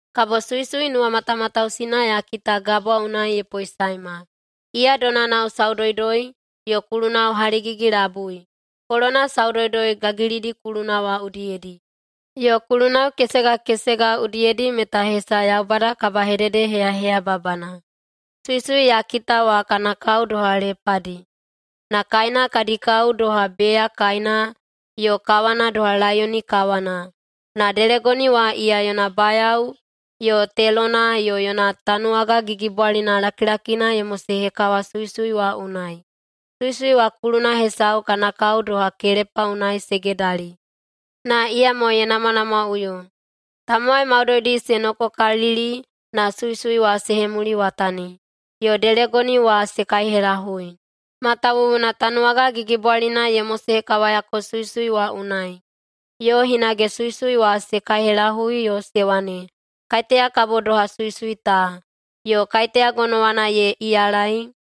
Kabo suisui nuwamatamatausina ya kita gabwa unai ye poesaema. Iya donanao saudoudoi yo kulunao haligigi-labui, kolona saudoudoi gagilidi kuluna wa udiyedi, yo kulunao kesega kesega udiyedi meta hesa Yaubada kabahededeheyaheyababana. Suisui ya kita wa kana kao doha lepadi, na kaena kadi kao doha beya kaena yo kawana doha laiyoni kawana. Na delegoni wa iya yona bayao yo telona yo yona tanuwaga gigibwalina lakilakina ye mosehekawa suisui wa unai. Suisui wa kuluna hesau kana kao doha kelepa unai se gedali na iyamo ye namwanamwaꞌuyo. Tamowai maudoidi se nokokalili na suisui wa se hemuliwatani. Yo delegoni wa se kaihelahui, matawuwuna tanuwaga gigibwalina ye mosehekawayako suisui wa unai, yo hinage suisui wa se kaihelahui yo se wane, “Kaiteya kabo doha suisui ta?” yo “Kaiteya gonowana ye iyalaei?”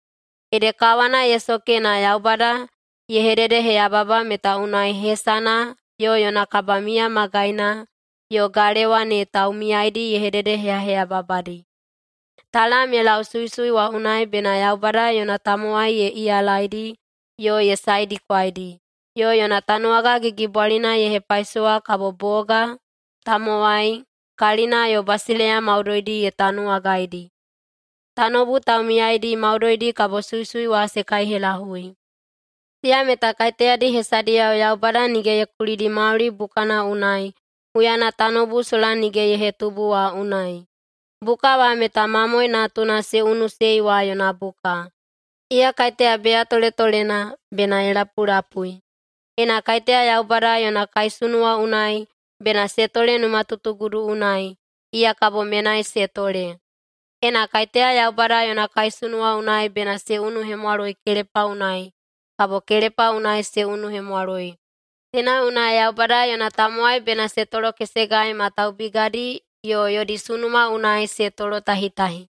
Ede kawana ye soke na Yaubada ye hededeheyababa meta unai hesana yo yona kabamiya magaina yo galewa ne taumiyaidi ye hededeheyaheyababadi. Talam ye lau suisui wa unai bena Yaubada yona tamowai ye iyalaidi yo ye saedikwaidi, yo yona tanuwaga gigibwalina ye hepaisowa kabo boga, tamowai, kalina yo basileiya maudoidi ye tanuwagaidi. Tanoubu taumiyaidi maudoidi kabo suisui wa se kaihelahui. Siya meta kaiteyadi hesadiyao Yaubada nige ye kulidi mauli bukana unai huyana tanoubu sola nige ye hetubu wa unai. Buka wa meta Mamoe Natuna se unuiꞌusei wa yona buka. Iya kaiteya beya toletolena, bena ye lapulapui! Ena kaiteya Yaubada yona kaisunuwa unai bena se tole numatutugudu unai, iya kabo menai se tole. Ena kaiteya Yaubada yona kaisunuwa unai bena se unuhemwaloi kelepa unai, kabo kelepa unai se unuhemwaloi. Teina unai Yaubada yona tamowai bena se tolokesegai ma taubigadi yo yodi sunuma unai se tolotahitahi.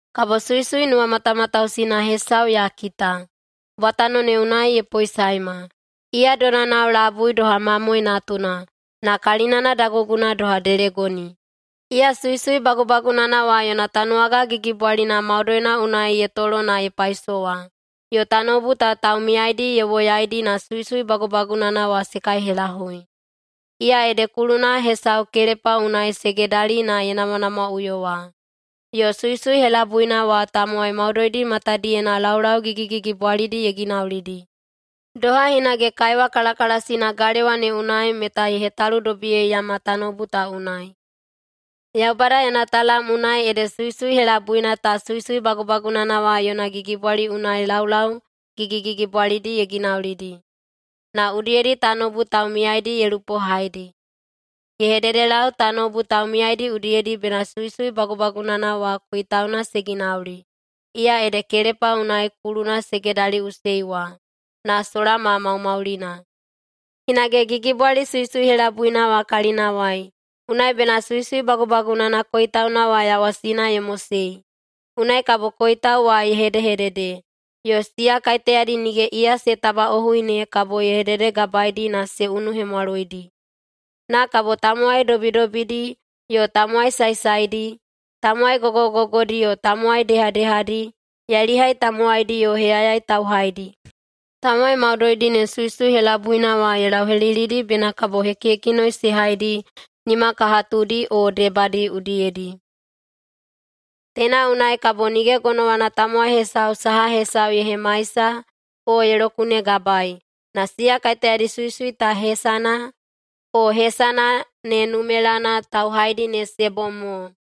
Kabo suisui nuwamatamatausina hesau ya kita, bwatano ne unai ye poesaema, iya donanao labui doha mamoe natuna, na kalinana daguguna doha delegoni. Iya suisui bagubagunana wa yona tanuwaga gigibwalina maudoina unai ye tolo na ye paisowa, yo tanoubu ta taumiyaidi ye woyaidi na suisui bagubagunana wa se kaihelahui. Iya ede kuluna hesau kelepa unai se gedali na ye namwanamwaꞌuyo wa. Yo suisui helabuina wa tamowai maudoidi matadiyena laulau gigigigibwalidi ye ginaulidi, doha hinage kaiwa kalakalasina galewa ne unai meta ye hetaludobiyeiyama tanoubu ta unai. Yaubada yona talam unai ede suisui helabuina ta suisui bagubagunana wa yona gigibwali unai laulau gigigigibwalidi ye ginaulidi, na udiyedi tanoubu taumiyaidi ye lupohaidi. Ye hededelau tanoubu taumiyaidi udiyedi bena suisui bagubagunana wa koitauna se ginauli, iya ede kelepa unai kuluna se gedaliꞌusei wa, na sola ma maumaulina. Hinage gigibwali suisui helabuina wa kalinawai, unai bena suisui bagubagunana koitauna wa yawasina ye mosei. Unai kabo koitau wa ye hedehedede, yo siya kaiteyadi nige iya se tabaꞌohui ne kabo ye hededegabaedi na se unuhemwaloidi. Na kabo tamowai dobidobidi yo tamowai saesaedi, tamowai gogogogodi yo tamowai dehadehadi, yailihai tamowaidi yo heyayai tauhaidi, tamowai maudoidi ne suisui helabuina wa ye lauhelilidi bena kabo hekihekinoi se haidi nimakahatudi o debadi udiyedi. Teina unai kabo nige gonowana tamowai hesau saha hesau ye hemaisa o ye lokunegabaei, na siya kaiteyadi suisui ta hesana, o hesana ne numelana tauhaidi ne se bom mo.